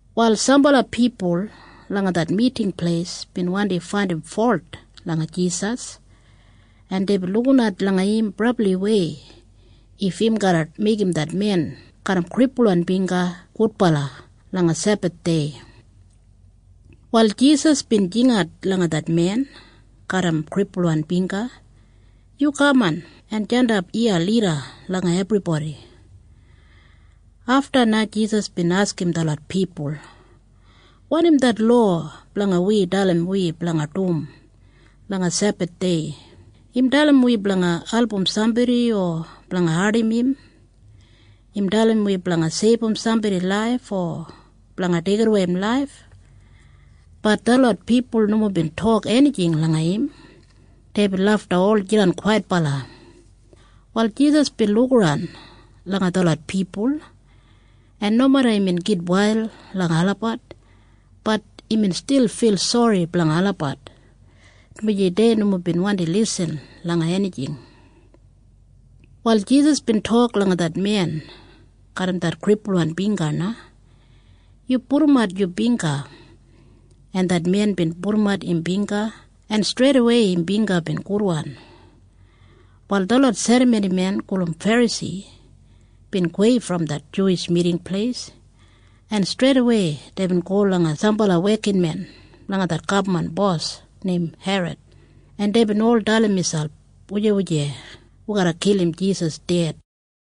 Wal sambala pipul langa det Miting Pleis bin wandi faindim folt langa Jisas, en deibin lukinat langa im brabliwei if im garra meigim det men garram kripulwan bingga gudbala langa Sebathdei. Wal Jisas bin jingat langa det men garram kripulwan bingga, “Yu kaman en jandap iya lida langa ebribodi.” Afta na Jisas bin askim detlot pipul, “Wanim det lowa blanga wi dalim wi blanga dum langa Sebathdei? Im dalim wi blanga album sambodi o blanga ardim im? Im dalim wi blanga seibum sambodi laif o blanga deigidawei im laif?” Bat detlot pipul nomo bin tok enijing langa im. Deibin lafta ol jidan kwaitbala. Wal Jisas bin lukaran langa detlot pipul, en nomeda imbin gitwail langa olabat, bat imbin stil fil sori blanga olabat, dumaji dei nomo bin wandi lisin langa enijing. Wal Jisas bin tok langa det men garram det kripulwan bingga na, “Yu pudumat yu bingga.” En det men bin pudumat im bingga, en streidawei im bingga bin gudwan. Wal detlot serramonimen gulum Ferasi bin gowei brom det Miting Pleis, en streidawei deibin go langa sambala wekinmen blanga det gabman bos neim Herod, en deibin ol dalim miselp, “Hau wi garra kilim Jisas ded?”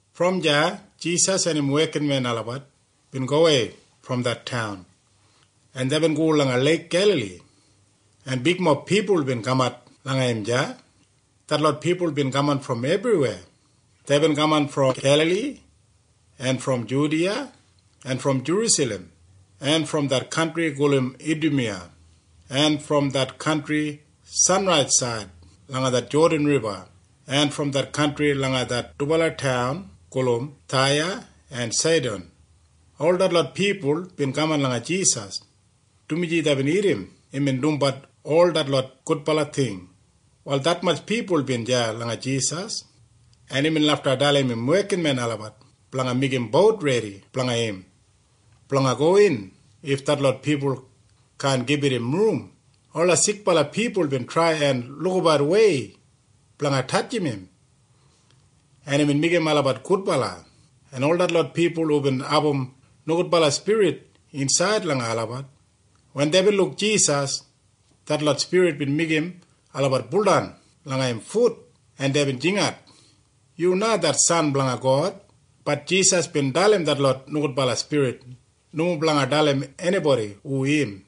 Brom deya Jisas en im wekinmen olabat bin gowei brom det taun, en deibin go langa Leik Gelali, en bigmob pipul bin kamat langa im deya. Detlot pipul bin kaman brom ebriweya. Deibin kaman brom Gelali en brom Judiya en brom Jerusalem en brom det kantri gulum Idumiya en brom det kantri sanraisaid langa det Jodan Riba en brom det kantri blanga det dubala taun gulum Taya en Saidan. Ol detlot pipul bin kaman langa Jisas, dumaji deibin irrim imbin dumbat ol detlot gudbala ting. Wal detmatj pipul bin deya langa Jisas, en imbin lafta dalim im wekinmen olabat blanga meigim bout redi blanga im blanga gowin if detlot pipul kaan gibit im rum. Ola sikbala pipul bin trai en lukabat wei blanga tatjimbat im, en imbin meigim olabat gudbala, en ol detlot pipul hubin abum nogudbala spirit insaid langa olabat, wen deibin luk Jisas, detlot spirit bin meigim olabat buldan langa im fut, en deibin jingat, “Yu na det San blanga God!” Bat Jisas bin dalim detlot nogudbala spirit nomo blanga dalim enibodi hu im.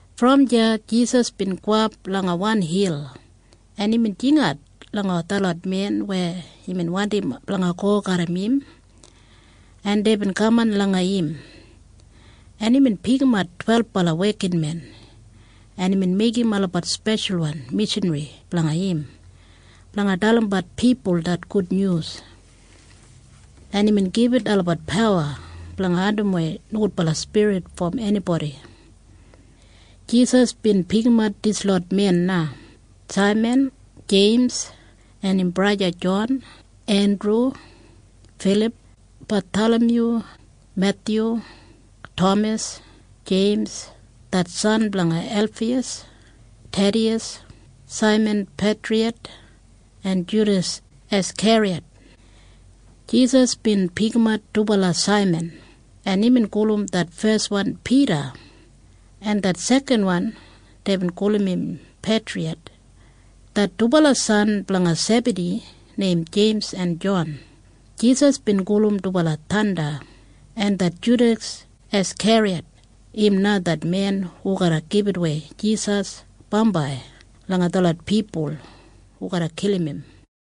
Brom deya Jisas bin gowap langa wan hil, en imbin jingat langa detlot men weya imbin wandim blanga go garram im, en deibin kaman langa im, en imbin pikimat twelbala wekinmen, en imbin meigim olabat speshalwan mishanri blanga im blanga dalimbat pipul det gudnyus, en imbin gibit olabat pawa blanga andimwei nogudbala spirit brom enibodi. Jisas bin pikimat dislot men na. Saiman, Jeims en im braja Jon, Endru, Filip, Bathalamyu, Methyu, Tamas, Jeims det san blanga Elfiyas, Thediyas, Saiman Peitriyat en Judas Askeriyat. Jisas bin pikimat dubala Saiman, en imbin gulum det feswan Pida, en det sekanwan deibin gulum im Peitriyat. Det dubala san blanga Sebadi neim Jeims en Jon, Jisas bin gulum dubala Thanda. En det Judas Askeriyat im na det men hu garra gibitawei Jisas bambai langa detlot pipul hu garra kilim im.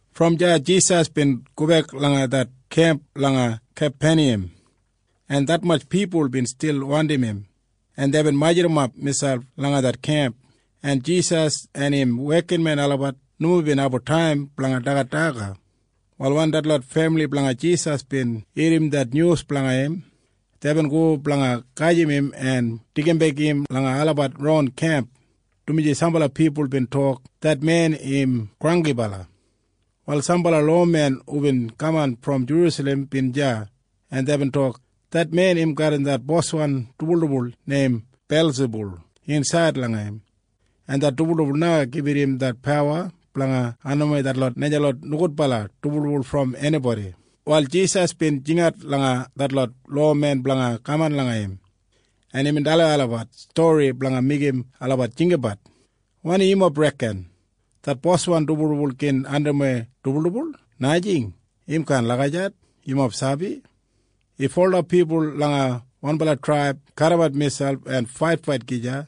Brom deya Jisas bin gobek langa det kemp langa Kapeniyam, en detmatj pipul bin stil wandim im, en deibin majurrumap miselp langa det kemp, en Jisas en im wekinmen olabat nomo bin abum taim blanga dagat daga. Wal wen detlot femili blanga Jisas bin irrim det nyus blanga im, deibin go blanga gajim im en deigimbek im langa olabat ron kemp, dumaji sambala pipul bin tok, “Det men im granggibala.” Wal sambala lowamen hubin kaman brom Jerusalem bin deya, en deibin tok, “Det men im garram det boswan dibuldibul neim Belsibul insaid langa im, en det dibuldibul na gibit im det pawa blanga andimwei detlot najalot nogudbala dibuldibul brom enibodi.” Wal Jisas bin jingat langa detlot lowamen blanga kaman langa im, en imbin dalim olabat stori blanga meigim olabat jinggabat. “Wanim yumob reken? Det boswan dibuldibul gin andimwei dibuldibul? Najing. Im kaan lagijat. Yumob sabi? If ola pipul langa wanbala traib kadimat miselp en faitfait gija,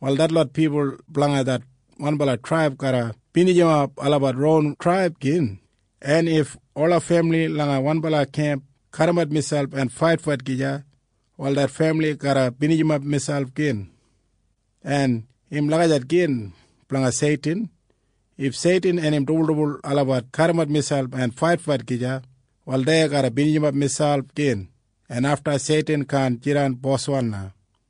wal detlot pipul blanga det wanbala traib garra binijimap olabat ronwan traib gin. En if ola femili langa wanbala kemp kadimat miselp en faitfait gija, wal det femili garra binijimap miselp gin. En im lagijat gin blanga Seitin. If Seitin en im dibuldibul olabat kadimat miselp en faitfait gija, wal dei garra binijimap miselp gin, en afta Seitin kaan jidan boswan na.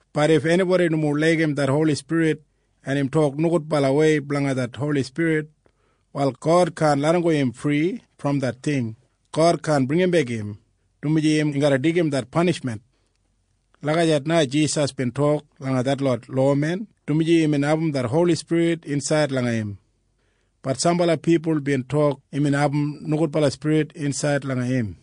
Bat if enibodi nomo laigim det Holi Spirit, en im tok nogudbalawei blanga det Holi Spirit, wal God kaan larramgo im fri brom det ting. God kaan bringimbek im, dumaji im garra deigim det panishmen.” Lagijat na Jisas bin tok langa detlot lowamen, dumaji imbin abum det Holi Spirit insaid langa im. Bat sambala pipul bin tok imbin abum nogudbala spirit insaid langa im.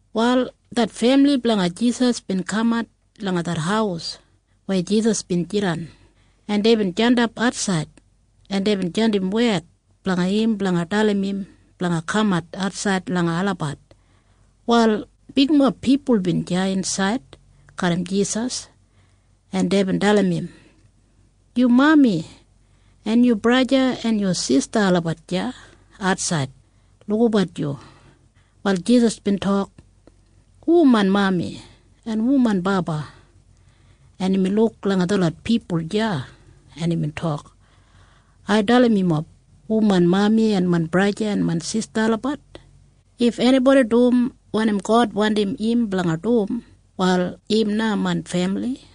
Wal det femili blanga Jisas bin kamat langa det haus weya Jisas bin jidan, en deibin jandap atsaid, en deibin jandim wed blanga im blanga dalim im blanga kamat atsaid langa olabat. Wal bigmob pipul bin deya insaid garram Jisas, en deibin dalim im, “Yu mami en yu braja en yu sista olabat deya atsaid lukabat yu.” Wal Jisas bin tok, “Hu main mami en hu main baba?” En imbin luk langa detlot pipul deya, en imbin tok, “Ai dalim yumob hu main mami en main braja en main sista olabat. If enibodi dum wanim God wandim im blanga dum, wal im na main femili.”